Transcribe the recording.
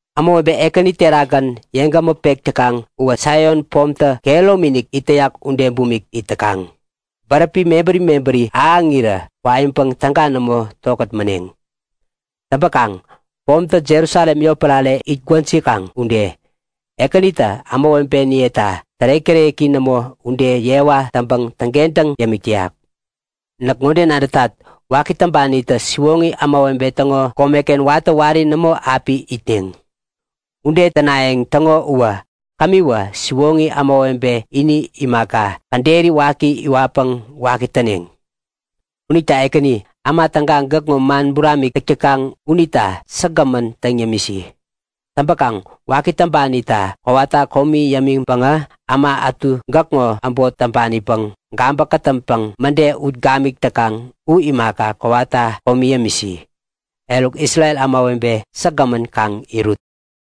Ämawebe Ekäni terakgän yeŋgämä pek täkaŋ uwä Saion pomtä kehäromi-inik it täyak ude bumik it täkaŋ. Bäräpi mebäri mebäri ahäŋirä kwaiŋpäŋ täga nämo tokät maneŋ. Täŋpäkaŋ pomtä Jerusalem yotpärare it gwäjikaŋ ude, Ekänitä ämawebeniyeta tärek-täreki nämo ude yewa täŋpäŋ täŋkentäŋ yämik täyak. Näk ŋode nadätat; Waki täŋpanitä siwoŋi ämawebe täŋo komeken watä wari nämo api itneŋ. Ude tänayäŋ täŋo uwä kämiwä siwoŋi ämawebe ini imaka, käderi waki iwatpäŋ waki täneŋ. Unita Ekäni, äma täga, gäkŋo man buramik täk täkaŋ unita säkgämän täŋ yämisi. Täŋpäkaŋ waki täŋpanita kowata komi yämiŋpäŋä äma ätu gäkŋo äbot täŋpanipäŋ gabä-kätäŋpäŋ mäde ut gamik täkaŋ u imaka, kowata komi yämisi. Eruk, Isrel ämawebe säkgämän kaŋ irut!